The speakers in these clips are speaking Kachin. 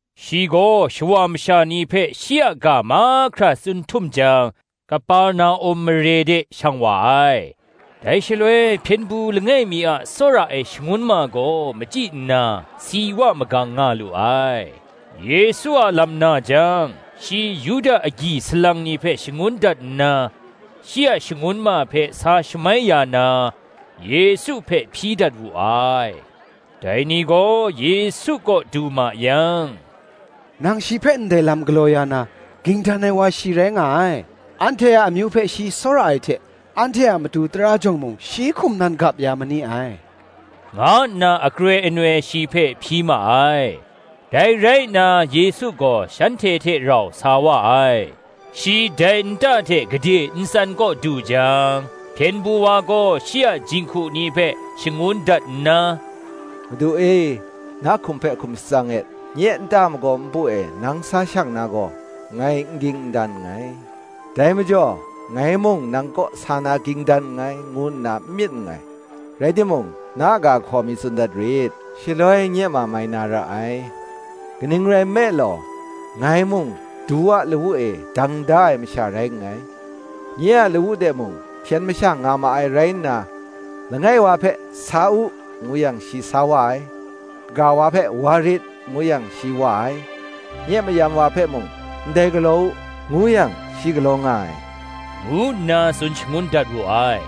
Shi gaw shawa masha ni hpe shi a ga mahkra tsun htum jang, Kaperna-um mare de shang wa ai. Dai shaloi hpyen du langai mi a tsawra ai shangun ma gaw machyi nna, si wa magang nga lu ai. Yesu a lam na jang, shi Yuda agyi salang ni hpe shangun dat nna, shi a shangun ma hpe sa shamai ya na, Yesu hpe hpyi dat wu ai. Dai ni gaw Yesu kaw du ma yang, Nang shi hpe ndai lam galaw ya na, ging dan ai wa shi rai nga ai; anhte a amyu hpe shi tsawra ai hte, anhte a matu tara jawng mung shi hkum nan gap ya ma ni ai, nga nna akroi anoi shi hpe hpyi ma ai. Dai rai nna Yesu gaw shanhte hte rau sa wa ai. Shi dai nta hte gade n tsan kaw du jang, hpyen du wa gaw shi a jinghku ni hpe shangun dat nna, Madu e, na hkum hpe hkum shatsang et; nye nta a magaw npu e nang sa shang na gaw, ngai n ging n dan nngai: dai majaw ngai mung nang kaw sa na ging dan nngai, ngu nna n myit nngai: rai timung, na ga hkaw mi tsun dat rit, shaloi nye ma mai na ra ai. Kaning rai nme law, ngai mung du a lawu e dang da ai masha rai nngai: nye a lawu de mung hpyen masha nga ma ai rai nna, langai wa hpe, Sa u, ngu yang, shi sa wa ai; kaga wa hpe, Wa rit, ngu yang, shi wa ai: nye mayam wa hpe mung, Ndai galaw u, ngu yang, shi galaw nga ai, ngu nna tsun shangun dat wu ai.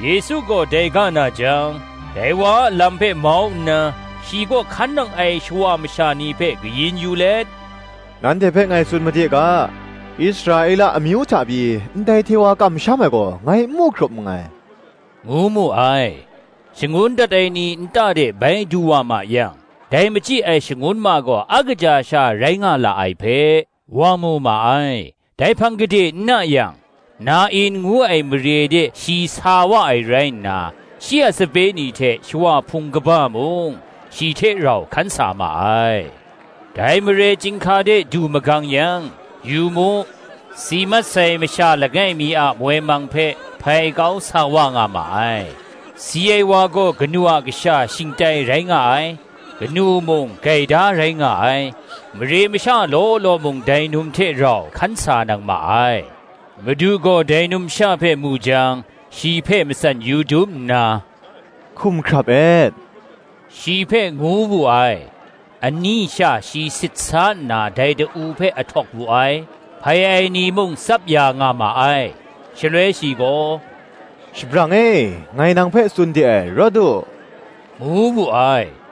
Yesu gaw dai ga na jang, dai wa a lam hpe mau nna, shi kaw hkan nang ai shawa masha ni hpe kayin yu let, Nanhte hpe ngai tsun made ga, Israela amyu hta pyi, ndai hte wa kamsham ai gaw ngai n mu hkrup nngai, ngu mu ai. Shangun dat ai ni nta de bai du wa ma yang, dai machyi ai shangun ma gaw a kaja sha rai nga la ai hpe, wa mu ma ai. Dai hpang gade n na yang, Na-in ngu ai mare de shi sa wa ai rai nna, shi a sape ni hte shawa hpung kaba mung, shi hte rau hkan sa ma ai. Dai mare chyinghka de du magang yang, yu mu, si mat sai masha langai mi a moi mang hpe hpai kau sa wa nga ma ai; si ai wa gaw kanu a kasha shingtai rai nga ai; kanu mung gaida rai nga ai; mare masha law law mung dai num hte rau hkan sa nang ma ai. Madu gaw dai numsha hpe mu jang, shi hpe matsan yu dum nna, Hkum hkrap et, shi hpe ngu wu ai. Ani sha shi sit sa nna dai da-u hpe ahtawk wu ai; hpai ai ni mung tsap ya nga ma ai: shaloi shi gaw, Shabrang e, ngai nang hpe tsun de ai, rawt u, ngu wu ai.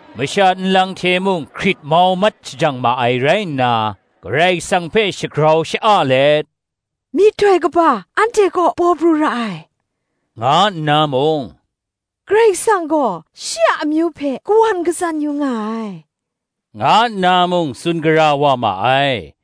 Masha nlang hte mung hkrit mau mat shajang ma ai rai nna, Karai Kasang hpe shagrau sha-a let, Myihtoi kaba anhte kaw paw pru ra ai, nga nna mung, Karai Kasang gaw shi a amyu hpe kawan katsan yu nga ai, nga nna mung, tsun gara wa ma ai.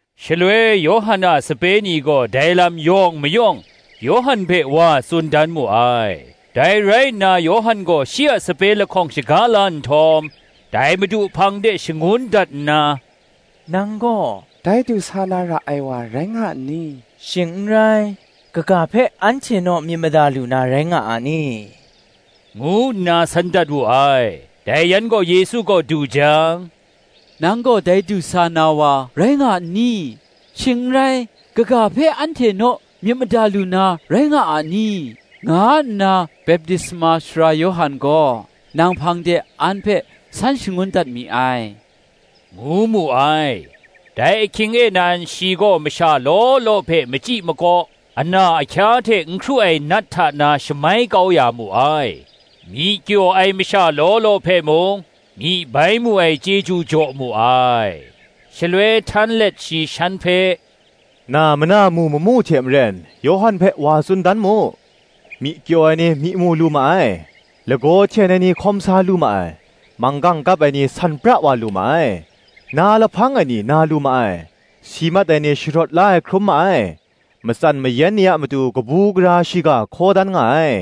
Shaloi Yawhan a sape ni gaw dai lam yawng mayawng Yawhan hpe wa tsun dan mu ai. Dai rai nna Yawhan gaw shi a sape lahkawng shaga la nhtawm, dai Madu hpang de shangun dat nna, Nang gaw dai du sa na ra ai wa rai nga n ni? shing n rai, kaga hpe anhte naw myit mada lu na rai nga a ni? ngu nna san dat wu ai. Dai yan gaw Yesu kaw du jang, Nang gaw dai du sa na wa rai nga n ni? shing n rai, kaga hpe anhte naw myit mada lu na rai nga a ni? nga nna Baptisma Sara Yawhan gaw, nang hpang de an hpe san shangun dat mi ai, ngu mu ai. Dai ahkying e nan shi gaw masha law law hpe machyi makaw, ana ahkya hte n hkru ai nat hta na shamai kau ya mu ai: myi kyaw ai masha law law hpe mung, myi bai mu ai chyeju jaw mu ai. Shaloi htan let shi shan hpe, Na mana mu mamu hte maren Yawhan hpe wa tsun dan mu: myi kyaw ai ni myi mu lu ma ai, lagaw hten ai ni hkawm sa lu ma ai, manggang kap ai ni san pra wa lu ma ai, na lahpang ai ni na lu ma ai, si mat ai ni sharawt la ai hkrum ma ai, matsan mayan ni a matu kabu gara shiga hkaw dan nga ai: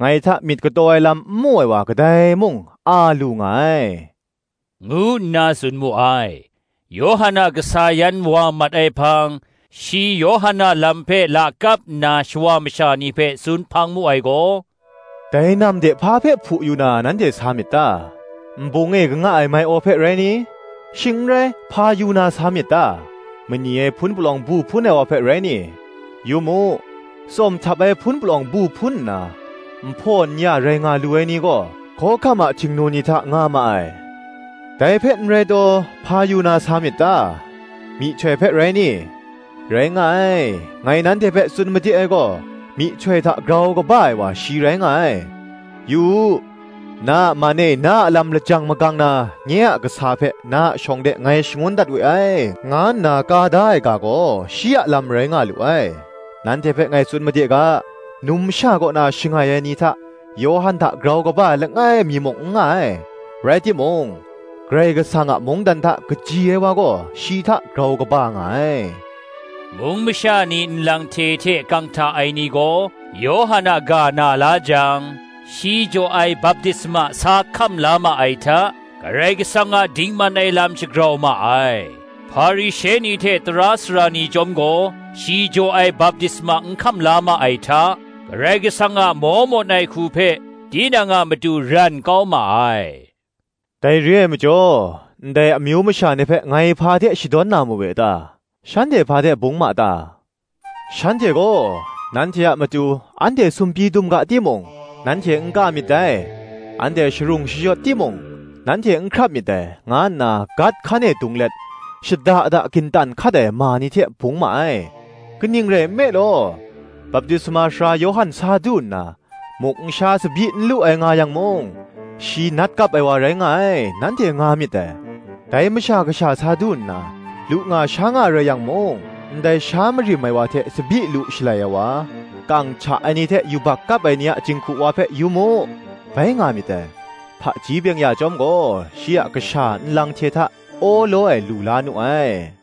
ngai hta myit kataw ai lam n mu ai wa kadai mung a lu nga ai, ngu nna tsun mu ai. Yawhan a kasa yan wa mat ai hpang, shi Yawhan a lam hpe lakap nna shawa masha ni hpe tsun hpang mu ai gaw, Dai nam de hpa hpe hpu yu na nanhte sa myit ta? nbung e kanga ai mai-aw hpe rai ni? Shing n rai, hpa yu na sa myit ta? mani ai hpun palawng bu hpun ai wa hpe rai ni? yu mu, tsawm htap ai hpun palawng bu hpun nna nhpaw n-ya rai nga lu ai ni gaw, hkawhkam a htingnu ni hta nga ma ai. Dai hpe n rai taw, hpa yu na sa myit ta? myihtoi hpe rai ni? Rai nga ai; ngai nanhte hpe tsun made ai gaw, myihtoi hta grau kaba ai wa shi rai nga ai. Yu u, na a man e na a lam lajang magang na, Nye a kasa hpe na a shawng de ngai shangun dat we ai, nga nna ka da ai ga gaw shi a lam rai nga lu ai. Nanhte hpe ngai tsun made ga, Numsha kaw na shangai ai ni hta, Yawhan hta grau kaba ai langai mi muk n nga ai: rai timung Karai Kasang a mungdan hta kaji ai wa gaw shi hta grau kaba nga ai. Mung masha ni nlang hte hte kang hta ai ni gaw, Yawhan a ga na la jang, shi jaw ai baptisma sa hkam la ma ai hta, Karai Kasang a dingman ai lam shagrau ma ai. Hparishe ni hte tara sara ni chyawm gaw, Shi jaw ai baptisma n hkam la ma ai hta, Karai Kasang a maw mawn ai hku hpe, tinang a matu ran kau ma ai. Dai re ai majaw, ndai amyu masha ni hpe ngai hpa hte shadawn na mawe ta? shanhte hpa hte bung ma ta? Shanhte gaw, Nanhte a matu anhte sumpyi dum ga timung, nanhte n ka myit dai, Anhte sharung shayawt timung, nanhte n hkrap myit dai, nga nna gat hkan e dung let, shada da gintan hkat ai ma ni hte bung ma ai. Kaning rai nme law, Baptisma Sara Yawhan sa du nna, muk n sha tsabyi n lu ai nga yang mung, Shi nat kap ai wa rai nga ai, nanhte nga myit dai. Dai Masha Kasha sa du nna, lu nga sha nga rai nga yang mung, Ndai sha marim ai wa hte tsabyi lu shalai ai wa, kang hta ai ni hte yubak kap ai ni a jinghku wa hpe, yu mu, bai nga myit dai. Hpaji byeng-ya chyawm gaw, shi a kasha nlang hte hta awlaw ai lu la nu ai.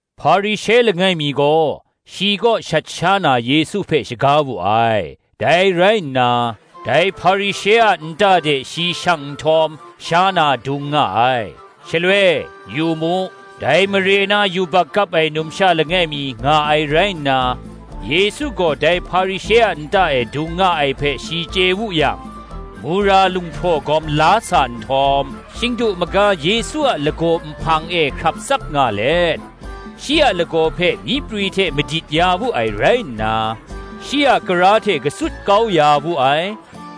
Hparishe langai mi gaw, shi kaw shat sha na Yesu hpe shaga wu ai. Dai rai nna, dai Hparishe a nta de shi shang nhtawm, sha na dung nga ai. Shaloi, yu mu, dai mare na yubak kap ai numsha langai mi nga ai rai nna, Yesu gaw dai Hparishe a nta e dung nga ai hpe shi chye wu yang mura lunghpraw gawm la sa nhtawm, shingdu maga Yesu a lagaw nhpang e hkrap tsap nga let shi a lagaw hpe myi prwi hte madit ya wu ai rai nna, shi a kara hte katsut kau ya wu ai: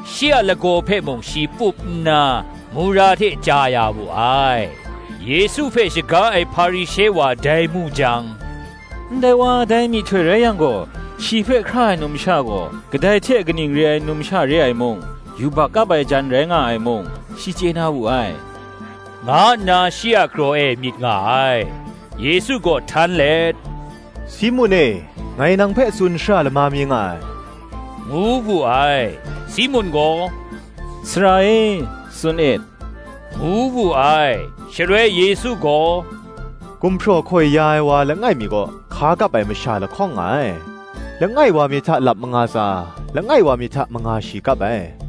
shi a lagaw hpe mung shi pup nna, mura hte chya ya wu ai. Yesu hpe shaga ai Hparishe wa dai mu jang, Ndai wa dai myihtoi rai yang gaw, shi hpe hkra ai numsha gaw, kadai hte kaning re ai numsha re ai mung, yubak kap ai jan rai nga ai mung, shi chye na wu ai, nga nna shi a kraw e myit nga ai. Yesu gaw htan let, Simun e, ngai nang hpe tsun shara lama mi nga ai, ngu wu ai. Simun gaw, Sara e, tsun e, ngu wu ai. Shaloi Yesu gaw, Gumhpraw hkoi ya ai wa langai mi kaw, hka kap ai masha lahkawng nga ai: langai wa mi hta lap manga tsa, langai wa mi hta manga shi kap ai.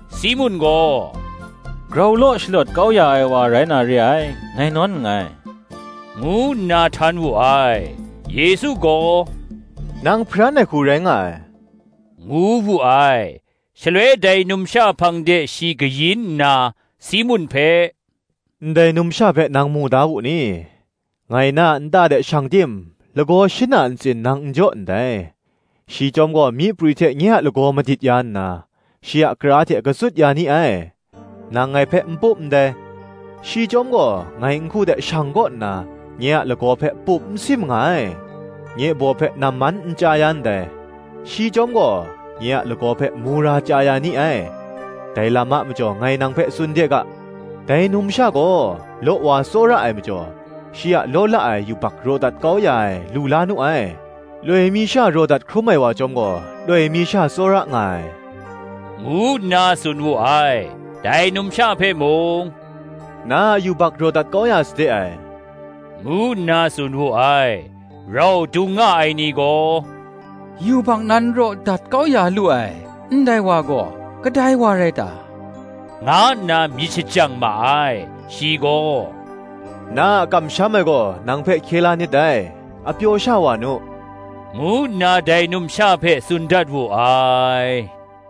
Simun gaw, Grau law shalawt kau ya ai wa rai na re ai, ngai nawn nngai, ngu nna htan wu ai. Yesu gaw, Nang hparan ai hku rai nga ai, ngu wu ai. Shaloi dai numsha hpang de shi kayin nna, Simun hpe, Ndai numsha hpe nang mu da wu ni? Ngai na a nta de shang tim’ lagaw shin na ntsin nang n jaw ndai: shi chyawm gaw myi prwi hte nye a lagaw madit ya nna, shi a kara hte katsut kau ya ni ai. Nang ngai hpe n pup ndai: shi chyawm gaw, ngai nhku de shang kaw nna, nye a lagaw hpe pup n sim nga ai. Nye baw hpe namman n chya ya ndai: shi chyawm gaw nye a lagaw hpe, mura chya ya ni ai. Dai lam a majaw ngai nang hpe tsun de ga, Dai numsha gaw law wa tsawra ai majaw, shi a law la ai yubak raw dat kau ya ai lu la nu ai: loi mi sha raw dat hkrum ai wa chyawm gaw loi mi sha tsawra nga ai, ngu nna tsun wu ai. Dai numsha hpe mung, Na a yubak raw dat kau ya sade ai, ngu nna tsun wu ai. Rau dung nga ai ni gaw, Yubak nan raw dat kau ya lu ai, ndai wa gaw, kadai wa rai ta? nga nna myit shajang ma ai. Shi gaw, Na a kamsham ai gaw nang hpe hkye la nit dai; a pyaw sha wa nu, ngu nna dai numsha hpe tsun dat wu ai.